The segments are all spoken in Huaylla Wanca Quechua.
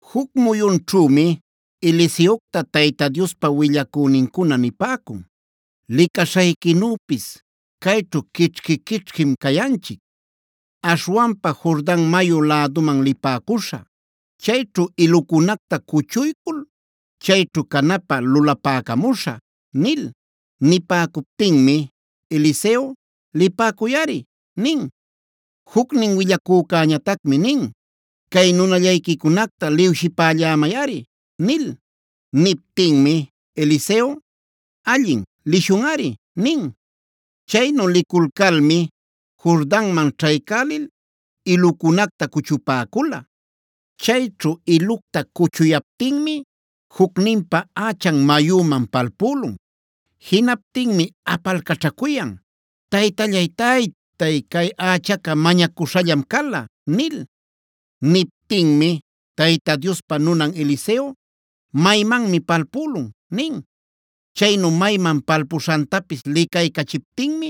Juc muyunćhümi Eliseocta Tayta Diospa willacünincuna nipäcun: “Licaśhayquinüpis, cayćhu quićhqui-quićhquim cayanchic. Aśhwanpa Jordan mayu läduman lipäcuśhä. Chayćhu ilucunacta cuchuycul chayćhu canapä lulapäcamuśhä” nil. Nipäcuptinmi Eliseo: “Lipäcuyꞌari” nin. Jucnin willacücäñatacmi nin: “Cay nunallayquicunacta liwshipällämayꞌari” nil. Niptinmi Eliseo: “Allin, lishunꞌari” nin. Chaynu liculcalmi Jordanman ćhaycälil ilucunacta cuchupäcula. Chayćhu ilucta cuchuyaptinmi jucninpa ächan mayüman palpülun. Jinaptinmi apalcaćhacuyan: “¡Taytallay, taytay! Chay ächaca mañacuśhallam cala” nil. Niptinmi Tayta Diospa nunan Eliseo: “¿Maymanmi palpülun?” nin. Chaynu mayman palpuśhantapis licaycachiptinmi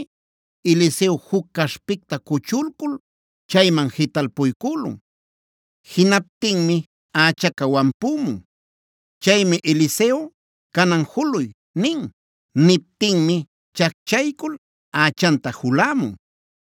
Eliseo juc caśhpicta cuchulcul chayman jitalpuycülun. Jinaptinmi ächaca wampümuna. Chaymi Eliseo: “Canan juluy” nin. Niptinmi chacchaycul ächanta julämun.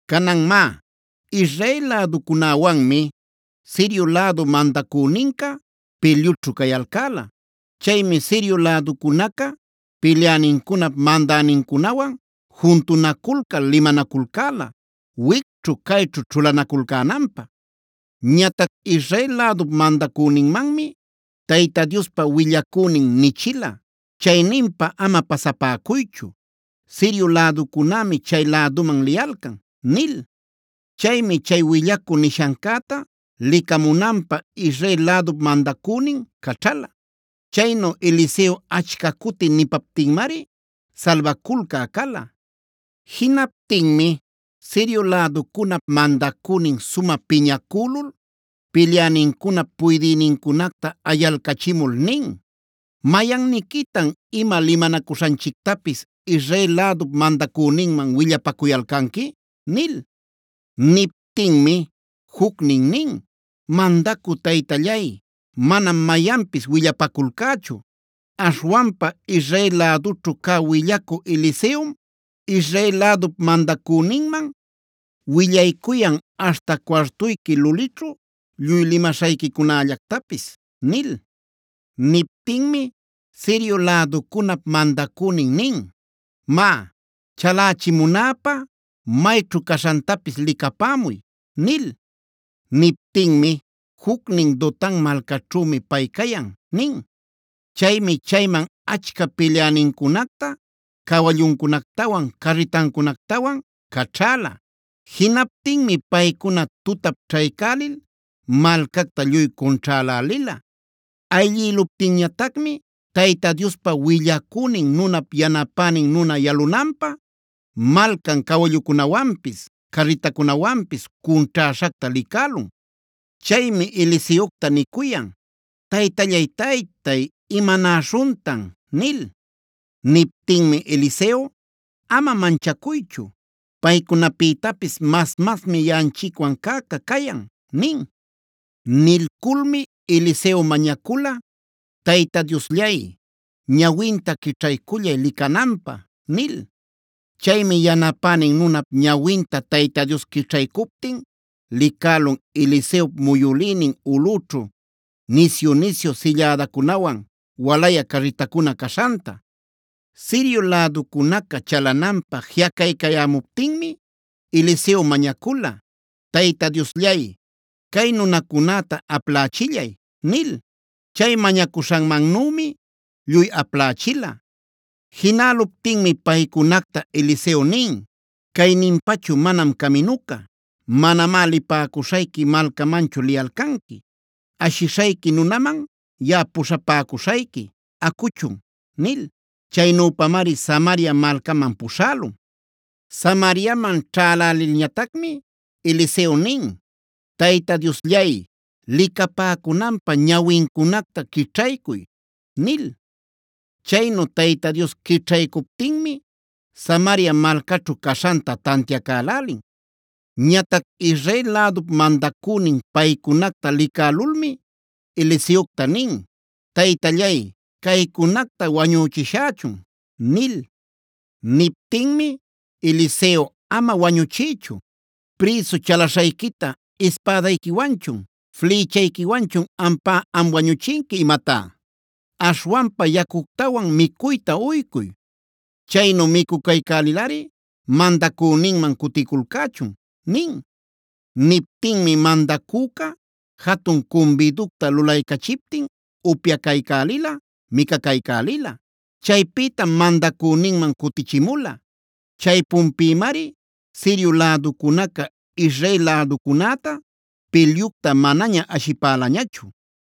Canan má, Israel läducunäwanmi Sirio lädu mandacüninca pilyućhu cayalcäla. Chaymi Sirio läducunaca pilyänincunap mandänincunawan juntunaculcal limanaculcäla wicćhu cayćhu ćhulanaculcänanpä. Ñatac Israel lädup mandacüninmanmi Tayta Diospa willacünin nichila: “Chayninpa ama pasapäcuychu, Sirio läducunämi chay läduman liyalcan” nil. Chaymi chay willacü nishancäta licamunanpä Israel lädup mandacünin caćhala. Chaynu Eliseo achca cuti nipaptinmari salbaculcä cala. Jinaptinmi Sirio läducunap mandacünin sumä piñacülul pilyänincunap puydïnincunacta ayalcachimul nin: “¿Mayanniquitan ima limanacuśhanchictapis Israel lädup mandacüninman willapacuyalcanqui?” nil. Niptinmi jucnin nin: “Mandacü taytallay, manam mayanpis willapaculcächu. Aśhwanpa Israel lädućhu cä willacü Eliseom Israel lädup mandacüninman willaycuyan aśhta cuartuyqui lulićhu lluy limaśhayquicunällactapis” nil. Niptinmi Sirio läducunap mandacünin nin: “Má, chalächimunäpä mayćhu caśhantapis licapämuy” nil. Niptinmi jucnin: “Dotan malcaćhümi pay cayan” nin. Chaymi chayman achca pilyänincunacta cawalluncunactawan, carritancunactawan caćhäla. Jinaptinmi paycuna tutap ćhaycälil malcacta lluy cunćhälälila. Ayllïluptinñatacmi Tayta Diospa willacünin nunap yanapänin nuna yalunanpä malcan cawallucunawanpis carritacunawanpis cunćhäśhacta licälun. Chaymi Eliseocta nicuyan: “Taytallay-taytay, ¿imanaśhuntan?” nil. Niptinmi Eliseo: “Ama manchacuychu. Paycunapïtapis mas-masmi yaꞌanchicwan cäca cayan” nin. Nilculmi Eliseo mañacula: “Tayta Diosllay, ñawinta quićhaycullay licananpä” nil. Chaymi yanapänin nunap ñawinta Tayta Dios quićhaycuptin licälun Eliseop muyülïnin ulꞌućhu nisyu-nisyu sillädacunawan walayä carritacuna caśhanta. Sirio läducunaca chalananpä jiꞌacaycayämuptinmi Eliseo mañacula: “Tayta Diosllay, cay nunacunäta aplächillay” nil. Chay mañacuśhanmannümi lluy aplächila. Jinäluptinmi paycunacta Eliseo nin: “Cayninpachu manam caminuca. Manamá lipäcuśhayqui malcamanchu liyalcanqui. Ashishayqui nunaman yaꞌa puśhapäcuśhayqui; acuchun” nil. Chaynüpamari Samaria malcaman puśhälun. Samariaman ćhälälilñatacmi Eliseo nin: “Tayta Diosllay, licapäcunanpä ñawincunacta quićhaycuy” nil. Chaynu Tayta Dios quićhaycuptinmi Samaria malcaćhu caśhanta tantiacälälin. Ñatac Israel lädup mandacünin paycunacta licälulmi Eliseocta nin: “Taytallay, ¿caycunacta wañüchishächun?” nil. Niptinmi Eliseo: “Ama wañuchiychu. ¿¡Prïsu chalaśhayquita ispädayquiwanchun, flïchayquiwanchun ampá am wañuchinqui imatá!? Aśhwanpa yacuctawan micuyta uycuy. Chaynu micucaycälilꞌari mandacüninman cuticulcächun” nin. Niptinmi mandacüca jatun cumbiducta lulaycachiptin upyacaycälila, micacaycälila. Chaypïtam mandacüninman cutichimula. Chaypunpïmari Sirio läducunaca Israel läducunäta pilyucta manaña ashipälañachu.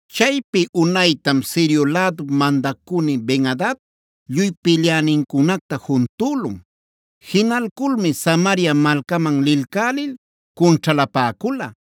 Chaypi unaytam Sirio lädup mandacünin Ben-adad lluy pilyänincunacta juntülun. Jinalculmi Samaria malcaman lilcälil cunćhalapäcula.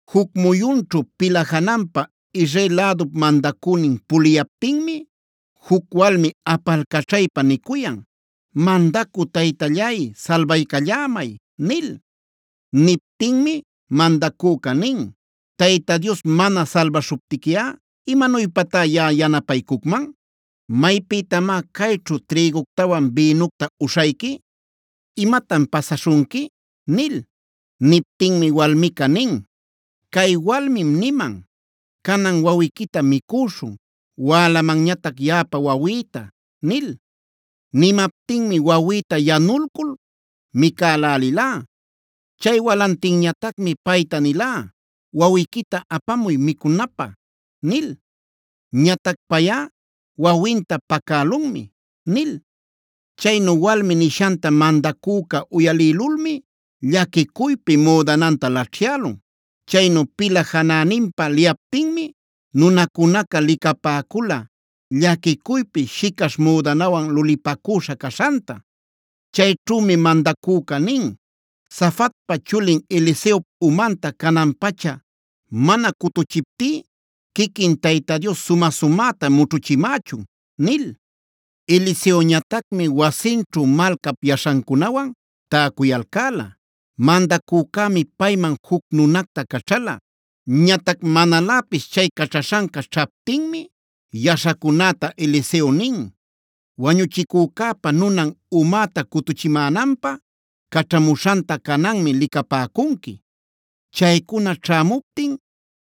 Juc muyunćhu pila jananpa Israel lädup mandacünin puliyaptinmi juc walmi apalcaćhaypa nicuyan: “¡Mandacü taytallay, salbaycallämay!” nil. Niptinmi mandacüca nin: “Tayta Dios mana salbaśhuptiquiꞌa ¿imanuypatá yaꞌa yanapaycucman? ¿Maypïtamá cayćhu trïguctawan bïnucta uśhayqui? ¿Imatan pasaśhunqui?” nil. Niptinmi walmica nin: “Cay walmim niman: ‘Canan wawiquita micüśhun, wälamanñatac yaꞌapa wawïta’ nil. Nimaptinmi wawïta yanulcul micälälilá.b Chay walantinñatacmi payta nilá: ‘Wawiquita apamuy micunapä’ nil. Ñatac payꞌa wawinta pacälunmi” nil. Chaynu walmi nishanta mandacüca uyalïlulmi llaquicuypi müdananta laćhyälun. Chaynu pila janäninpä liyaptinmi nunacunaca licapäcula llaquicuypi shicaśh müdanawan lulïpacüśha caśhanta. Chayćhümi mandacüca nin: “Safatpa chulin Eliseop umanta canan-pacha mana cutuchiptí quiquin Tayta Dios sumä-sumäta mućhuchimächun” nil. Eliseoñatacmi wasinćhu malcap yaśhancunawan täcuyalcäla. Mandacücämi payman juc nunacta caćhala. Ñatac manaläpis chay caćhaśhanca ćhaptinmi yaśhacunäta Eliseo nin: “Wañuchicücäpa nunan umäta cutuchimänanpä caćhamuśhanta cananmi licapäcunqui. Chaycuna ćhämuptin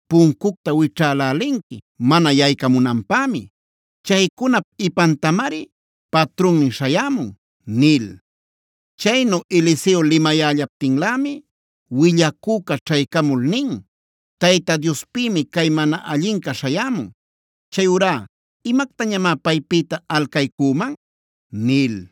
puncucta wićhälälinqui mana yaycamunanpämi. Chaycunap ipantamari patrunnin śhayämun” nil. Chaynu Eliseo limayällaptinlämi willacüca ćhaycamul nin: “Tayta Diospïmi cay mana allinca śhayämun. Chayurá ¿imactañamá paypïta alcaycüman?” nil.